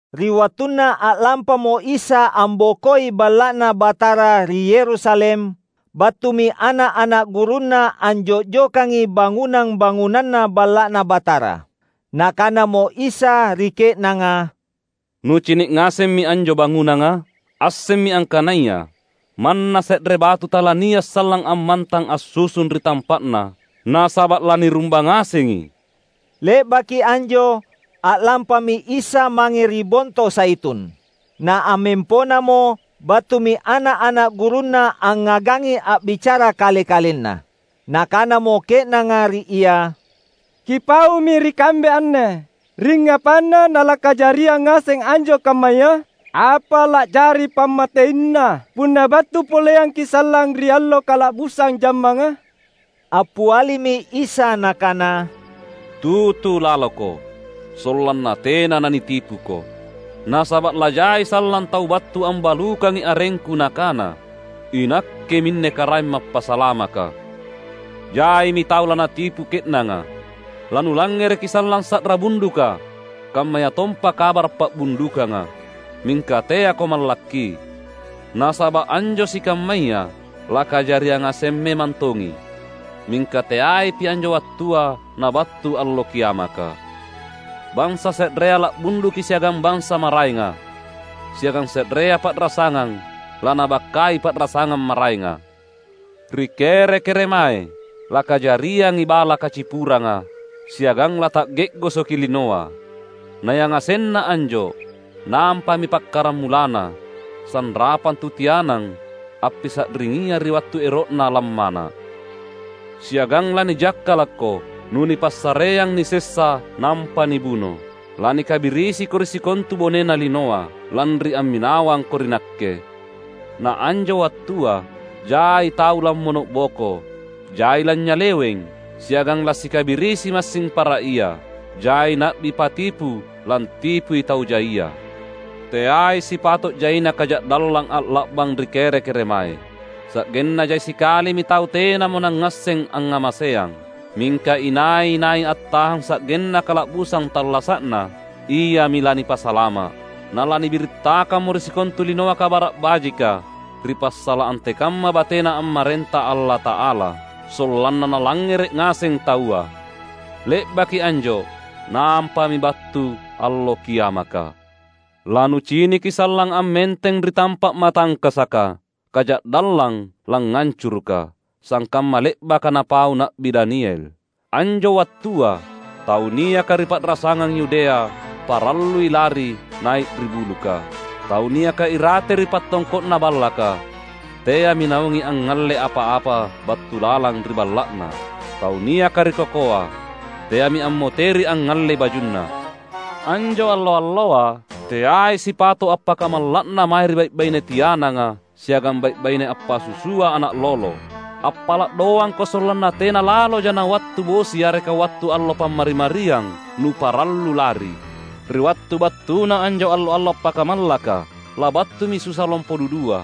Ri wattunna a’lampamo Isa ambokoi Balla’Na Batara ri Yerusalem, battumi ana’-ana’ gurunNa anjo’jokangi bangunang-bangunanna Balla’Na Batara. Nakanamo Isa ri ke’nanga, "Nucini’ ngasemmi anjo bangunanga? Assemmi angkanaya, manna se’re batu talania’ sallang ammantang assusung ri tampa’na, nasaba’ lanirumbang ngasengi!" Le’baki anjo, a’lampami Isa mange ri Bonto Zaitun. Na ammemponamo, battumi ana’-ana’ gurunNa angngagangi a’bicara kale-kalenna. Nakanamo ke’nanga ri Ia, "Kipaumi ri kambe anne, singngapanna nalakajariang ngaseng anjo kammaya? Apa la’jari pammateina punna battu poleangKi’ sallang ri allo kala’busang jammanga?" Appialimi Isa Nakana, "Tutu laloko, sollanna tena nanitipuko. Nasaba’ lajai sallang tau battu ambalukangi arengKu nakana, ‘Inakke minne Karaeng Mappasalamaka!’ Jaimi tau lanatipu ke’nanga. Lanulangngereki sallang sa’ra bunduka, kammayatompa kabara’ pa’bundukanga. Mingka teako mallakki. Nasaba’ anjo sikammaya lakajariang ngaseng memang tongi; mingka teaipi anjo wattua nabattu allo kiamaka. Bansa se’rea la’bunduki siagang bansa maraenga, siagang se’rea pa’rasangang lanabakkai pa’rasangang maraenga. Ri kere-keremae lakajariangi bala kacipuranga siagang lata’ge’gosoki linoa. Na yangasenna anjo nampami pakkaramulanna, sanrapang tu tianang appisa’ringia ri wattu ero’na lammana’. Siagang lanijakkalakko nunipassareang nisessa nampa nibuno. Lanikabirisiko ri sikontu bonena linoa, lanri amminawangko ri Nakke. Na anjo wattua jai tau lammono’boko; jai lanynyaleweng, siagang lasikabirisi massing para ia. Jai na’bi patipu lantipui tau jaia. Teai sipato’ jaina kaja’dallang alla’bang ri kere-keremae, sa’genna jai sikalimi tau tenamo nangngasseng angngamaseang. Mingka inai-nai attahang sa’genna kala’busang tallasa’na, iami lanipasalama’. Na lanibirittakammo ri sikontu linoa Kabara’ Bajika, ri passala’ antekamma batena ammarenta Allata’ala, sollanna nalangngere’ ngaseng taua. Le’baki anjo nampami battu allo kiamaka." "Lanuciniki sallang ammenteng ri tampa’ matangkasaka, ‘Kaja’dallang langngancuruka’, sangkamma le’baka napau Na’bi Daniel. Anjo wattua, tau niaka ri pa’rasangang Yudea parallui lari nai’ ri buluka. Tau niaka irate ri pattongko’na ballaka teami naungi angngalle apa-apa battu lalang ri balla’na. Tau niaka ri kokoa teami ammoteri angngallei bajunna. Anjo allo-alloa teai sipato’ appakamalla’na mae ri bai’-baine tiananga siagang bai’-baine appasusua ana’ lolo! Appala’ doangko sollanna tena laloja nawattu bosi yareka wattu allo Pammari-mariang, nuparallu lari! Ri wattu battuna anjo allo-allo appakamallaka labattumi susa lompo dudua,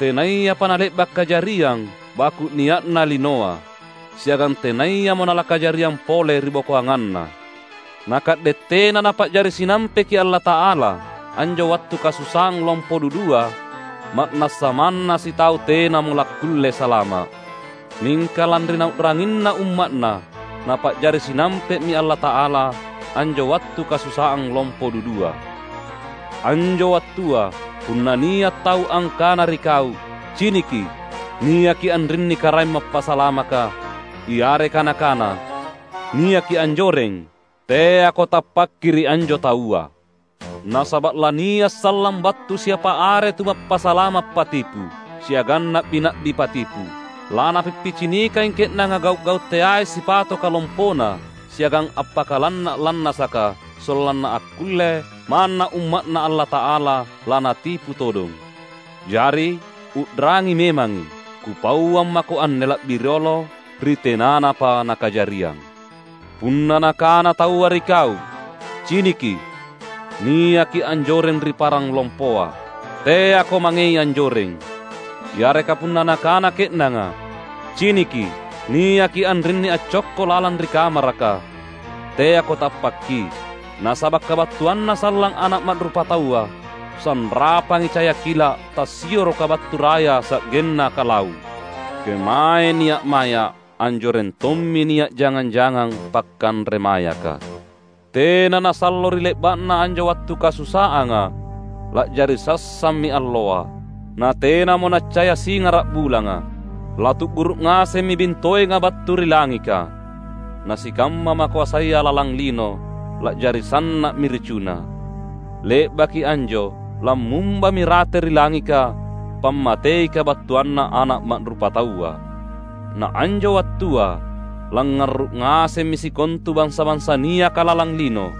tenayapa nale’ba’ kajariang baku’ nia’na linoa, siagang tenayamo nalakajariang pole ribokoanganna. Na ka’de’ tena Napa’jari sinampeki Allata’ala anjo wattu kasusaang lompo dudua, ma’nassa manna sitau tenamo lakkulle salama’. Mingka lanri Nau’ranginna umma’Na, Napa’jari sinampe’mi Allata’ala anjo wattu kasusaang lompo dudua. Anjo wattua, punna nia’ tau angkana ri kau, ‘Ciniki, niaki anrinni Karaeng Mappasalamaka!’ yareka nakana, ‘Niaki anjoreng!’ — teako tappakki ri anjo taua. Nasaba’ lania’ sallang battu siapa are tumappasalama’ patipu, siagang na’bi-na’bi patipu. Lanappicinikangi ke’nanga gau’-gau’ teai sipatoka lompona siagang appakalanna’-lannasaka, sollanna akkulle, manna umma’Na Allata’ala lanatipu todong. Jari, u’rangi memangi! Kupauang mako anne la’bi riolo ri tenanapa nakajariang. Punna nakana taua ri kau, ‘Ciniki, niaki anjoreng ri parang lompoa!’ — teako mangei anjoreng. Yareka punna nakana ke’nanga, ‘Ciniki, niaki anrinni accokko lalang ri kamaraka!’ — teako tappakki. Nasaba’ kabattuanNa sallang Ana’ Ma’rupataua sanrapangi caya kila’ tassioroka battu raya sa’genna kalau’. Kemae nia’ maya’, anjoreng tommi nia’ jangang-jangang pakanre mayaka." "Tena nasallo ri le’ba’na anjo wattu kasusaanga, la’jari sassammi alloa, na tenamo naccaya singara’ bulanga. Latu’guru’ ngasemmi bintoenga battu ri langika. Na sikamma makoasaya lalang lino, la’jari sanna’mi ricuna. Le’baki anjo lammumbami rate ri langika pammatei kabattuanNa Ana’ Ma’rupataua. Na anjo wattua langngarru’ ngasemmi sikontu bansa-bansa niaka lalang lino.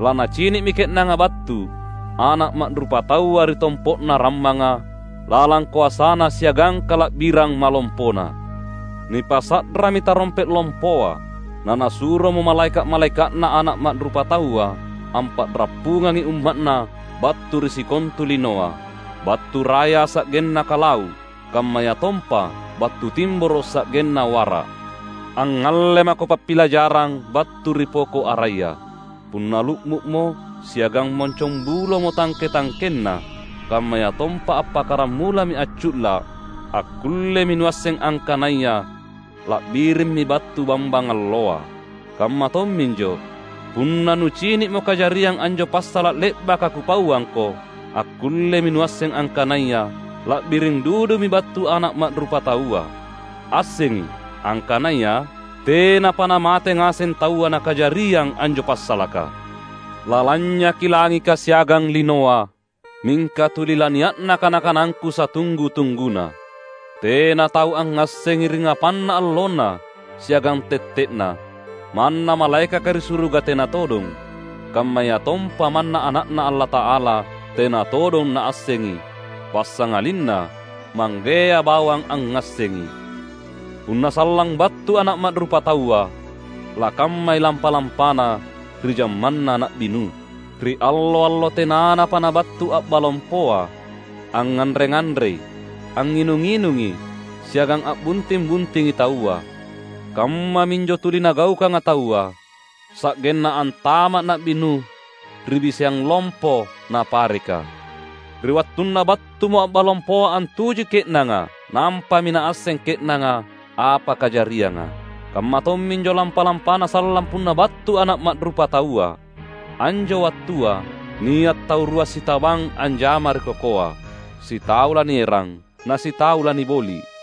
Lanacini’mi ke’nanga battu Ana’ Ma’rupataua ri tompo’na rammanga, lalang koasaNa siagang kala’birang malompoNa. Nipasa’rami tarompe’ lompoa. Na Nasuromo malaeka’-malaeka’Na Ana’ Ma’rupataua ampa’rappungangi umma’Na battu ri sikontu linoa, battu raya sa’genna kalau’, kammayatompa battu timboro’ sa’genna wara’." "Angngalle mako pappilajarang battu ri poko’ araya. Punna lu’mu’mo siagang moncongbulomo tangke-tangkenna, kammayatompa appakkaramulami accu’la’, akkullemi nuasseng angkanaya la’birimmi battu bambang alloa. Kamma tomminjo, punna nucini’mo kajariang anjo passala’ le’baka Kupauangko, akkullemi nuasseng angkanaya la’biring dudumi battu Ana’ Ma’rupataua. Assengi! Angkanaya, tenapa namate ngaseng taua nakajariang anjo passalaka. Lalanynyaki langika siagang linoa, mingka tuli lania’na kana-kanangKu satunggu-tungguna." "Tena tau angngassengi ringngapanna allonna siagang tette’na; manna malaekaka ri suruga tena todong; kammayatompa manna Ana’Na Allata’ala tena todong Naassengi. Passangalinna Manggea bawang angngassengi. Punna sallang battu Ana’ Ma’rupataua, lakammai lampa-lampana ri jammanna Na’bi Nuh. Ri allo-allo tenanapa nabattu a’ba lompoa, angnganre-nganrei, angnginung-nginungi, siagang a’bunting-buntingi taua. Kammaminjo tuli nagaukanga taua, sa’genna antama’ Na’bi Nuh ri biseang lompo napareka. Ri wattunna battumo a’ba lompoa antujui ke’nanga nampami naasseng ke’nanga apa kajarianga. Kamma tomminjo lampa-lampana sallang punna battu Ana’ Ma’rupataua. Anjo wattua nia’ tau rua sitabang anjama ri kokoa: sitau lanierang, na sitau laniboli’.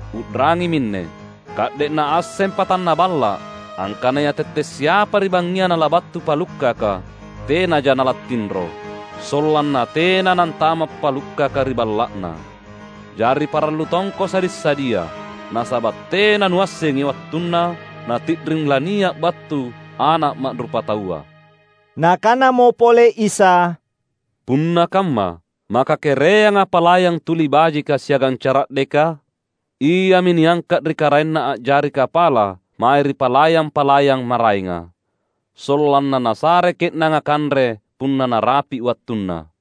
U’rangi minne! Ka’de’ naasseng patanna balla’ angkanaya tette’ siapa ri bangngia nalabattu palukkaka, tenaja nalattinro, sollanna tena nantama’ palukkaka ri balla’na. Jari parallu tongko sadi’-sadia. Nasaba’ tena nuassengi wattunna nati’ring lania’ battu Ana’ Ma’rupataua." Nakanamo pole Isa, "Punna kamma, maka kereanga palayang tuli bajika siagang cara’deka? Iami niangka’ ri karaenna a’jari kapala mae ri palayang-palayang maraenga, sollanna nasare ke’nanga kanre punna narapi’ wattunna.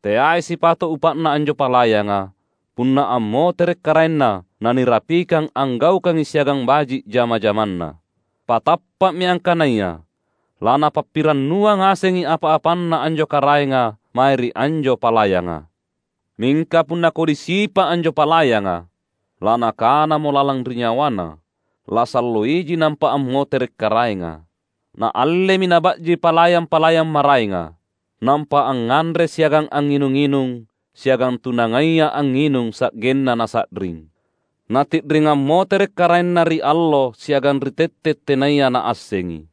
Teai sipato’ upa’na anjo palayanga, punna ammotere’ karaenna nanirapikang anggaukangi siagang baji’ jama-jamanna. Patappa’mi angkanaya lanapappirannuang ngasengi apa-apanna anjo karaenga mae ri anjo palayanga. Mingka punna kodi sipa’ anjo palayanga, lanakanamo lalang ri nyawana, ‘Lasallo iji nampa ammotere’ karaenga,’ naallemi naba’ji palayang-palayang maraenga. Nampa angnganre siagang angnginung-nginung siagang tu nangaia angnginung sa’genna nasa’ring. Nati’ring ammotere’ karaenna ri allo siagang ri tette’ tenaya naassengi.